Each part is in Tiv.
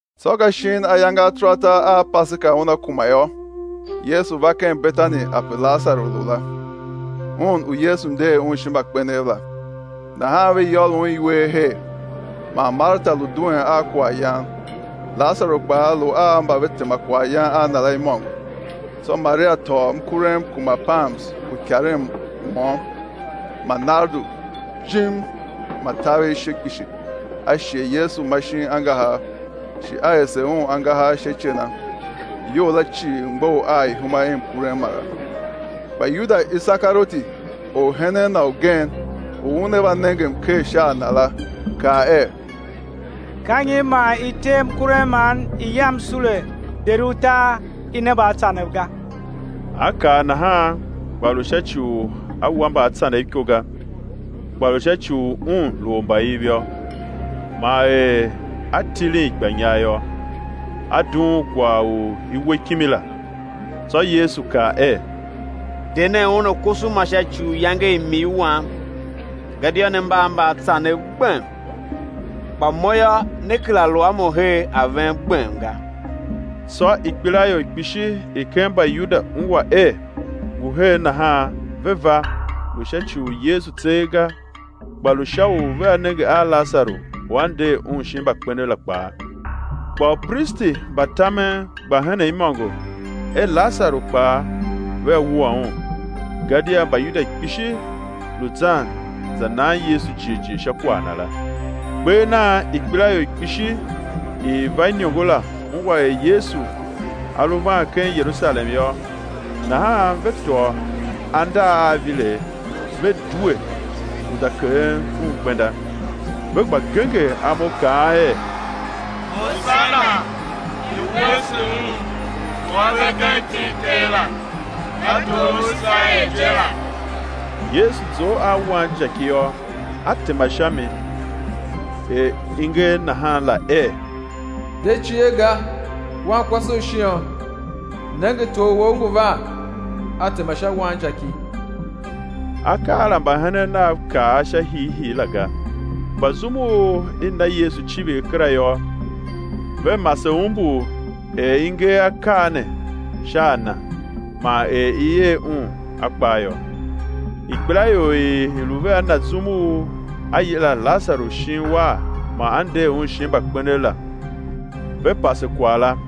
Tsô ka shin ayange ataratar a Paseka una kuma yô, Yesu va ken Betani ape Lasaru lu la, un u Yesu nder un shin mbakpenev la. Nahan ve yôr Un iwer her man Marta lu duen a kwaghyan Lasaru kpaa lu a mba ve tema kwaghyan a Na la imôngo. Tsô Maria tôô mkurem kuma pams u ikaren môm, ma nardu jim ma taver ishe kpishi, a shighe Yesu ma shin angahar, shi a ese Un angahar sha ice na; iyou la cii mgbough a ihuma i mkurem mara. Kpa Yuda Isekarioti, orhenen Na ugen, u una va nenge mker sha a Na la, kaa er: Ka nyi man i tee mkurem man i yam sule deri utar i ne mbaatsanev ga? A kaa nahan, kpa lu sha ci u a wa mbaatsanev iko ga, kpa lu sha ci u un lu ormbaiv yô, man er a tilin ikpanyar yô, a dughun kwagh u i we kimi la. Tsô Yesu kaa er: De nen un, a koso ma sha ci u iyange i m-ii Wam. Gadia ne mba a mbaatsanev gbem, kpa Mo yô, né kera lu a Mo her a ven gbem ga. Tsô ikpelaior kpishi i ken Mbayuda ungwa er ngu her nahan ve va, lu sha ci u Yesu tseegh ga, kpa lu sha u vea nenge a Lasaru u A nder un shin mbakpenev la kpaa. Kpa upristi mba tamen gba henen imôngo er Lasaru kpaa vea wua un; gadia Mbayuda kpishi lu zan za nan Yesu jighjigh sha kwagh na la. Kper nan ikpelaior kpishi i i va iniongo la ungwa er Yesu A lu van ken Yerusalem yô, nahan ve tôô andar a avilegh, ve due u za keghen Un gbenda, ve gba genger imo, kaan er: Hosana! I̱ wuese Un u A ve ken iti i Ter la, ka Tor u Iserael je la. Yesu zough a wanjaki yô, A tema sha mi, er i nger nahan la er: De cie ga, wankwase u Shion, nenge Tor wou ngu van, A tema sha wanjaki. Akaa la mbahenen Nav kav a sha hiihii la ga, kpa zum u i na Yesu icivir kera yô, ve mase umbur er i nger akaa ne sha a Na, man er i er Un a kpaa yô. Ikpelaior i i lu vea Na zum u A yila Lasaru shin uwar man A nder un shin mbakpenev la, ve pase kwagh la.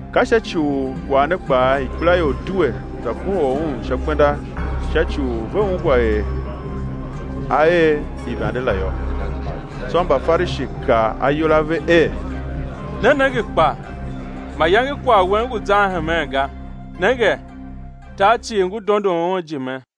Ka sha ci u kwagh ne kpaa ikpelaior due, za kohol Un sha gbenda sha ci u ve ungwa er A er ivande la yô. Tsô Mbafarishi kaa ayol a ve er: Ne nenge kpa, mayange kwagh wen ngu zan hemen ga; nenge, tar cii ngu dondon Un ijime.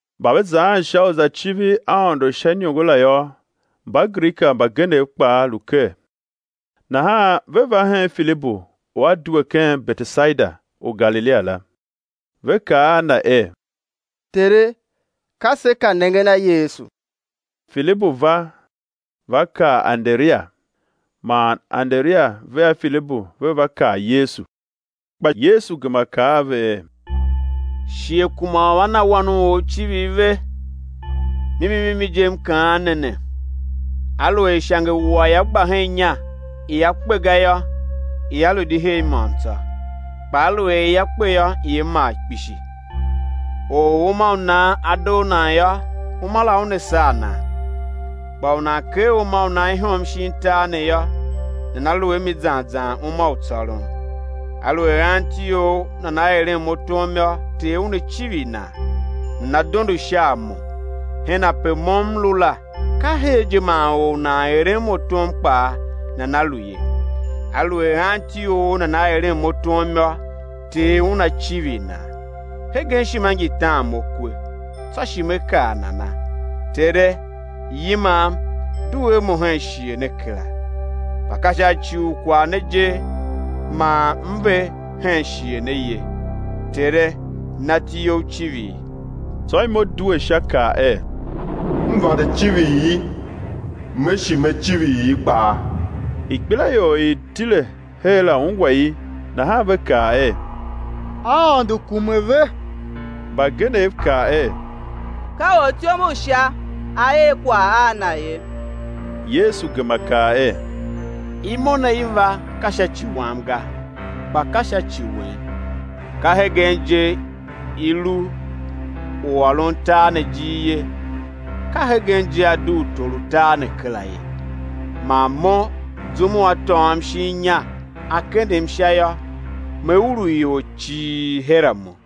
Mba ve zaan sha u za civir Aôndo sha iniongo la yô, Mbagrika mbagenev kpaa lu ker. Nahan ve va hen Filibu u a due ken Betesaida u Galilia la, ve kaa a na er: Tere, ka se ka nengen a Yesu. Filibu va, va kaa Anderia; man Anderia vea Filibu ve va kaa Yesu. Kpa Yesu gema kaa a ve er: Shighe kuma u a na Wan u or icivir ve. Mimi mimi je, M kaan ne ne, aluer ishangewua ia gba hen inya ia kpe ga yô, ia lu di her môm tsô; kpa aluer ia kpe yô, ia mar kpishi. Or u uma u nan a doo nan yô, uma la una saa nan; kpa u nan ker uma u nan ihom shin tar ne yô, nana lu a mi zan zan uma u tsôron. Aluer anti or nana eren Mo tom yô, Ter Una civir nan, nana̱ dondo sha a Mo; hen ape Mo M lu la, ka her je man or u nan eren Mo tom kpaa nana lu ye. Aluer anti or nana eren Mo tom yô, Ter Una civir nan. Hegen ishima ngi tan Mo kwe, tsô shi Me kaa nana? Tere, yimam due a Mo hen shighe ne kera! Kpa ka sha ci u kwagh ne je man M ve hen shighe ne ye. Tere, na iti You icivir. Tsô imo due Sha kaa er: M vande civir i, Me shi Me civir i kpaa. Ikpelaior i i tile her la ungwa i nahan ve kaa er: Aôndo kume ve! Mbagenev kaa er: Ka ortyom u Sha a er kwagh a Na ye. Yesu gema kaa er: Imo ne i va, ka sha ci Wam ga, kpa ka sha ci wen. Ka hegen je i lu u ôron tar ne ijiir ye; ka hegen je á dugh tor u tar ne kera ye. Man Mo zum u á tôôm shin inya á kendem sha yô, Me urugh ior cii her a Mo.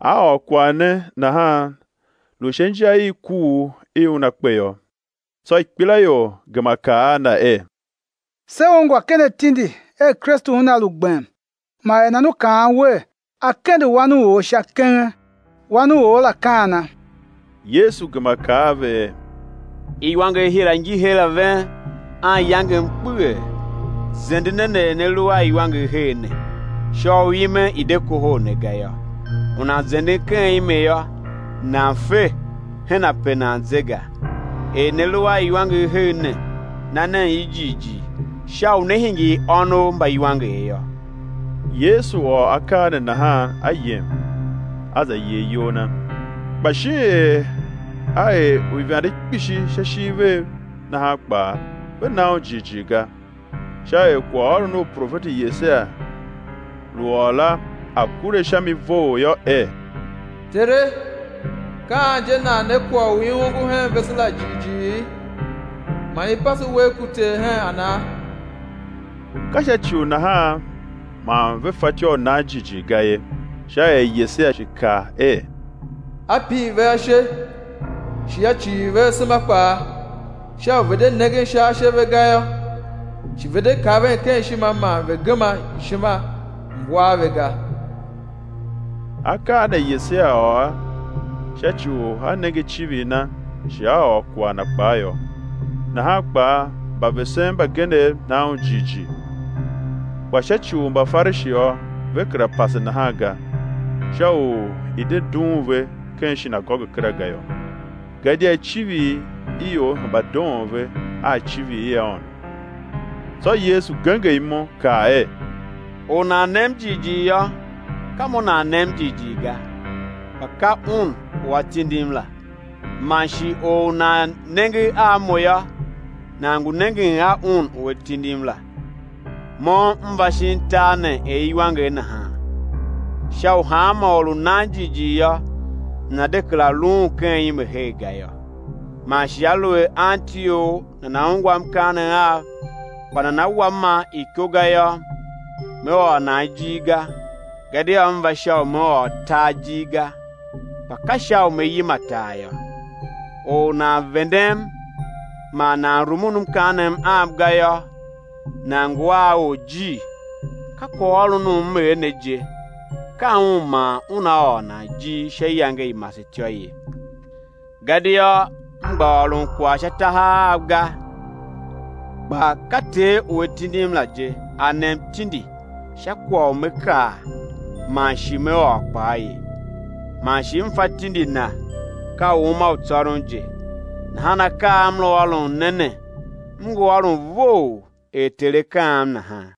A ôr kwagh ne nahan, lu sha inja i kuugh i Una kpe yô. Tsô ikpelaior gema kaa a Na er: Se ungwa ken atindi er Kristu Una lu gbem; man er nan U kaan Wer, á kende Wan u or sha kenge? Wan u or la ka ana? Yesu gema kaa a ve er: Iwanger hira ngi her a ven anyangem kpeghee; zende nen er ne lu a iwanger her ne, sha u ime i̱ de kohol ne ga yô. U nan zenden ken ime yô, nan fe hen ape nan ze ga. Er ne lu a iwanger her ne, na nen i jighjigh sha u né hingir ônov mba iwanger yô. Yesu ôr akaa ne nahan A yem, A za yer iyol Na. Kpa shin er A er uivande kpishi sha ishiv vev, nahan kpaa ve na Un jighjigh ga, sha er kwaghôron u profeti Yesaia lu ôr la a̱ kure sha mi vough yô, er: Tere, ka an je nan ne kwagh u i ongo hen vese la jighjighi? Man i pase uwegh ku Ter hen ana? Ka sha ci u nahan man ve fatyô u nan jighjigh ga ye, sha er Yesaia shi kaa er: A pir ve ashe, shi A cighir ve asema kpaa, sha u ve̱ de nengen sha ashe ve ga yô, shi ve̱ de kaven ken ishima man ve̱ gema ishima, M̱ war ve ga. Akaa ne Yesaia ôr sha ci u a nenge icivir Na shi a ôr kwagh Na kpaa yô. Nahan kpaa mbavesen mbagenev na Un jighjigh; kpa sha ci u Mbafarishi yô, ve kera pase nahan ga, sha u i̱ de dughun ve ken shinagoge kera ga yô; gadia icivir i ior hemba doon ve a icivir i Aôndo. Tsô Yesu genger imo kaa er: Or u nan nem jighjigh yô, ka Mo nan nem jighjigh ga, kpa ka Un u A tindim la, man shi or u nan nenge a Mo yô, nan ngu nengen a Un u A tindim la. Mo M va shin tar ne er iwanger nahan, sha u hanma or u nan jighjigh yô, nana̱ de kera luun ken ime her ga yô. Man shi aluer anti or nana ungwa mkaanem Am, kpa nana wa ma iko ga yô, Me ôr nan ijir ga; gadia M va sha u Me ôr tar ijir ga, kpa ka sha u Me yima tar yô. Or u nan vendem man nan rumun mkaanem Am ga yô, nan ngu a orjir, ka kwaghôron u M er ne je, ka un man una ôr nan ijir sha iyange i masetyô ye. Gadia M gba ôron kwagh sha tahav Av ga; kpa ka Ter u A tindim la je, A nem tindi sha kwagh u Me kaa man shi Me ôr kpaa ye. Man shi M fa tindi Na ka u uma u tsôron je. Nahan akaa a M lu ôron ne ne M ngu ôron vough er Ter A kaam nahan.